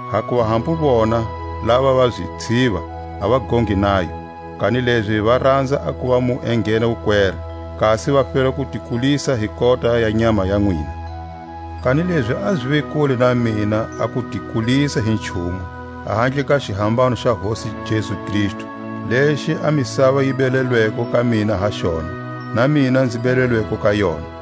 Hakuva hambu vona lava va zitshiva a va gongi nayo; kanilezi va ranza a kuva mu enghena wukwera, kasi va fela ku ti kulisa hi kota ya nyama ya nwina. Kanilezi a zive kule na mina a ku ti kulisa hi nchumu, ahandle ka xihambano xa Hosi Jesu Kristu, lexi a misava yi belelweko ka mina ha xona, na mina nzi belelweko ka yona.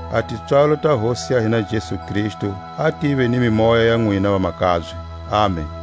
A tipswalo ta Hosi ya hina Jesu Kristu a tive ni mimoya ya nwina, vamakabye. Amen!